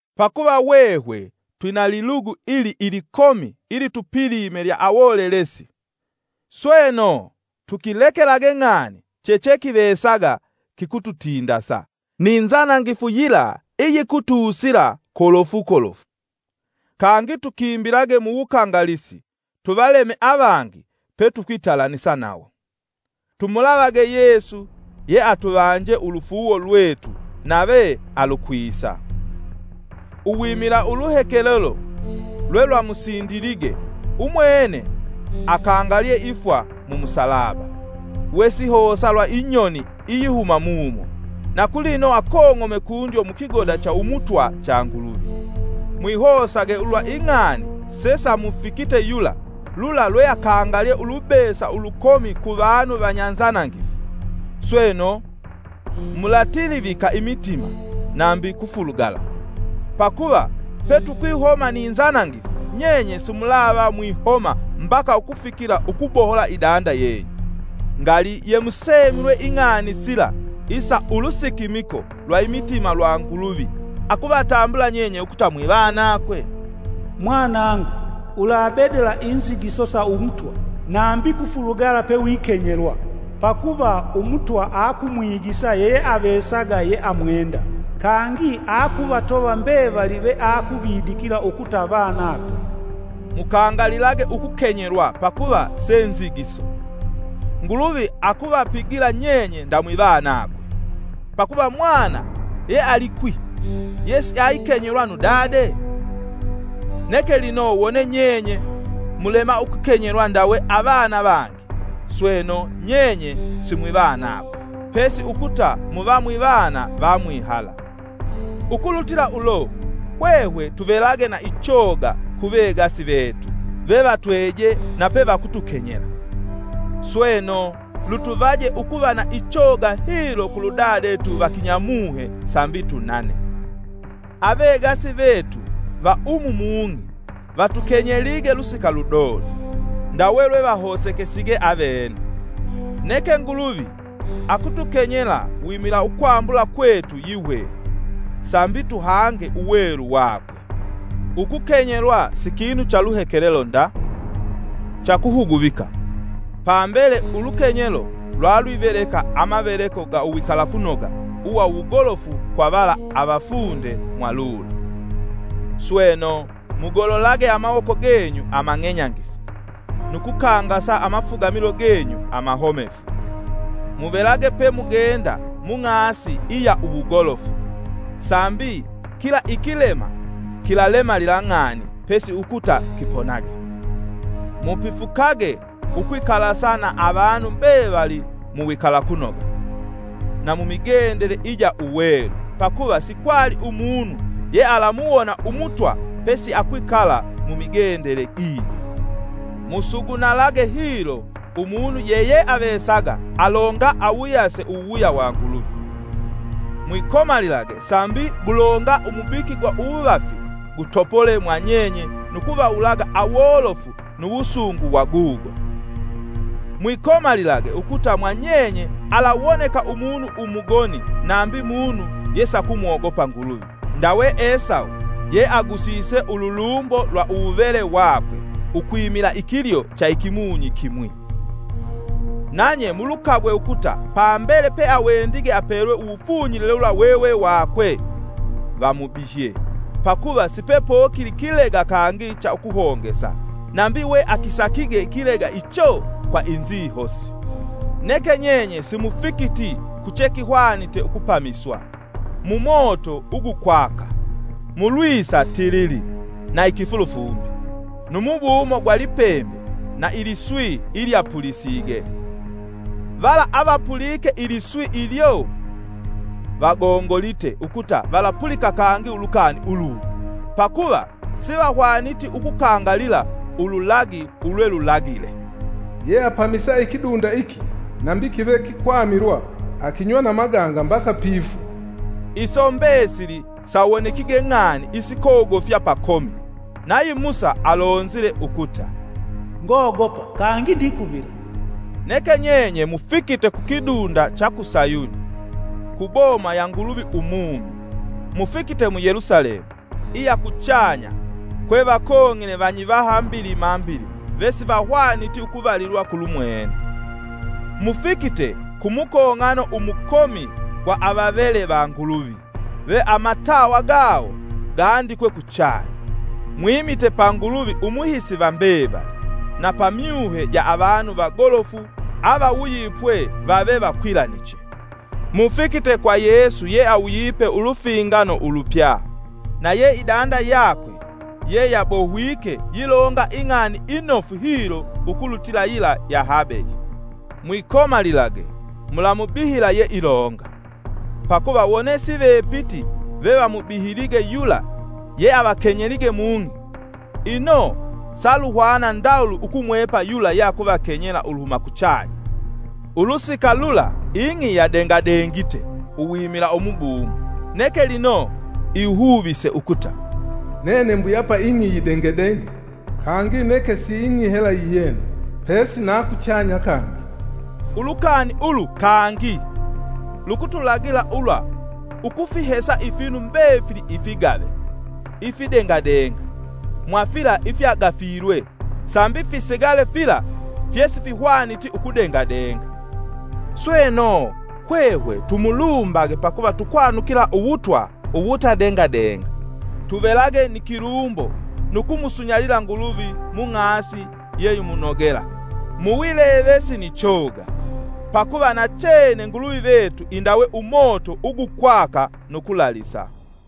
Pakuva hwehwe twina lilugu ili ilikomi ilitupilime lya awolelesi. Sweno, tukilekelage ng'ani chechekivesaga kikututindasa, ni nzanangifu yila iyikutusila kolofu kolofu. Kangi tukimbilage mu wukangalisi tuvaleme avangi petukwitalanisa nawo. Tumulavage Yesu yeatuvanje ulufuuwo lwetu nave alukwisa. Uwimila uluhekelelo lwelwamusindilige, umwene akangalye ifwa mu musalaba, we sihosa lwa inyoni iyihuma mumo, na kulino akong'ome kundyo mukigoda cha umutwa cha Nguluvi. Mwihosage ulwa ing'ani sesamufikite yula, lula lweakangalye ulubesa ulukomi kuvanu vanyanzanangifu. Sweno, mulatilivika imitima, nambi kufulugala. Pakuva petukwihoma ni nzanangifu, nyenye simulava mwihoma mbaka ukufikila ukubohola idanda yenyu. Ngali, yemusemilwe ing'ani sila isa ulusikimiko lwa imitima lwa Nguluvi akuvatambula nyenye ukuta mwivanakwe? “Mwanangu, ulabedala inzigiso sa Umutwa, nambi kufulugala pewikenyelwa, pakuva Umutwa akumwigisa yeyeavesaga yeamwenda, kangi akuvatova mbevali veakuvidikila ukuta vanakwe.” Mukangalilage ukukenyelwa pakuva se nzigiso; Nguluvi akuvapigila nyenye nda mwivanakwe. Pakuva mwana yealikwi yesiayikenyelwa nu dade? Neke lino wone nyenye mulema ukukenyelwa ndawe avana vangi, sweno, nyenye simwivanakwe, pesi ukuta muva mwivana vamwihala. Ukulutila ulo, hwehwe tuvelage na ichoga kuvegasi vetu vevatweje na pevakutukenyela. Sweno, lutuvaje ukuva na ichoga hilo kuludadetu va kinyamuhe sambi tunane. Avegasi vetu va umu mung'i vatukenyelige lusika ludodo, ndawe lwevahosekesige ukuta avene, neke Nguluvi akutukenyela wimila ukwambula kwetu yihwehwe, sambi tuhange Uwelu vakwe. Ukukenyelwa si kinu cha luhekelelo nda, cha kuhuguvika, pambele ulukenyelo lwalwiveleka amaveleko ga uwikalakunoga uwa uwugolofu kwa vala avafunde mwalulo. Sweno, mugololage amawoko genyu amang'enyangifu, nu kukangasa amafugamilo genyu amahomefu. Muvelage pemugenda mung'asi iya uwugolofu, sambi kila ikilema kilalemalila ng'ani pesi ukuta kiponage. Mupifukage ukwikalasa na avanu mbevali mu wikalakunoga. Na mu migendele ija uwelu, pakuva sikwali umunu yealamuwona Umutwa pesi akwikala mu migendele gijo. Musugunalage hilo umunu yeyeavesaga alonga awuyase uwuwuya wa Nguluvi. Mwikomalilage sambi gulonga umubiki gwa uwuvafi gutopole mwa nyenye nu kuvawulaga awolofu nu wusungu wa gugo. Mwikomalilage ukuta mwa nyenye alawoneka umunu umugoni nambi munu yesakumwogopa Nguluvi, ndawe Esawu, yeagusise ululumbo lwa uwuvele wakwe ukwimila ikilyo cha ikimunyi kimwi. Nanye mulukagwe ukuta pambele peawendige apelwe uwufunyilile wula wewe wakwe, vamubihye, pakuva sipepokili kilega kangi cha ukuhongesa, nambi we akisakige ikilega icho kwa inzihosi. Neke nyenye simufikiti ku che kihwanite ukupamiswa, mumoto ugukwaka, mulwisa tilili, na ikifulufumbi, nu mubumo gwa lipembe na iliswi ilyapulisige. Vala avapulike iliswi ilyo vagongolite ukuta valapulika kangi ulukani ulungi, pakuva sivahwaniti ukukangalila ululagi ulwelulagile; “Yeapamisa ikidunda iki nambi kive kikwamilwa, akinywa na maganga mbaka pifwa.” Iso mbesili sawonekige ng'ani isikogofya pakomi, nayi Musa alonzile ukuta, “Ngogopa kangi ndikuvila.” Neke nyenye mufikite ku kidunda cha ku Sayuni, ku Boma ya Nguluvi Umumi. Mufikite mu Yelusalemu, iya kuchanya, kwe vakong'ine vanyivaha mbilima mbilima vesivahwaniti ukuvalilwa kulumwene. Mufikite ku mukong'ano umukomi gwa avavele va Nguluvi ve amatawa gawo gaandikwe kuchanya. Mwimite pa Nguluvi umuhisi va mbevali, na pa myuhe ja avanu vagolofu avawuyipwe vave vakwilaniche. Mufikite kwa Yesu ye awuyipe ulufingano ulupya, na ye idanda yakwe yeyabohwike yilonga ing'ani inofu hilo ukulutila yila ya Habeli. Mwikomalilage mulamubihila yeilonga. Pakuva wone sivepiti pevamubihilige yula yeavakenyelige mung'i, ino saluhwana ndawuli ukumwepa yula yeakutukenyela uluhuma kuchanya. Ulusika lula ing'i yadengadengite uwimila umubumo, neke lino ihuvise ukuta, “Nene mbuyapa ing'i yidengedenge kangi neke si ng'i hela yiyena pesi na kuchanya kangi.” Ulukani ulu: “Kangi.” lukutulagila ulwa ukufihesa ifinu mbefili ifigave, ifidengadenga, mwafila ifyagafilwe, sambi fisigale fila fyesifihwaniti ukudengadenga. Sweno, hwehwe tumulumbage pakuva tukwanukila Uwutwa uwuta dengadenga. Tuvelage ni kilumbo nu kumusunyalila Nguluvi mu ng'asi yeyimunogela, muwilevesi ni choga; pakuva nachene Nguluvi vetu indawe umoto ugukwaka nu kulalisa.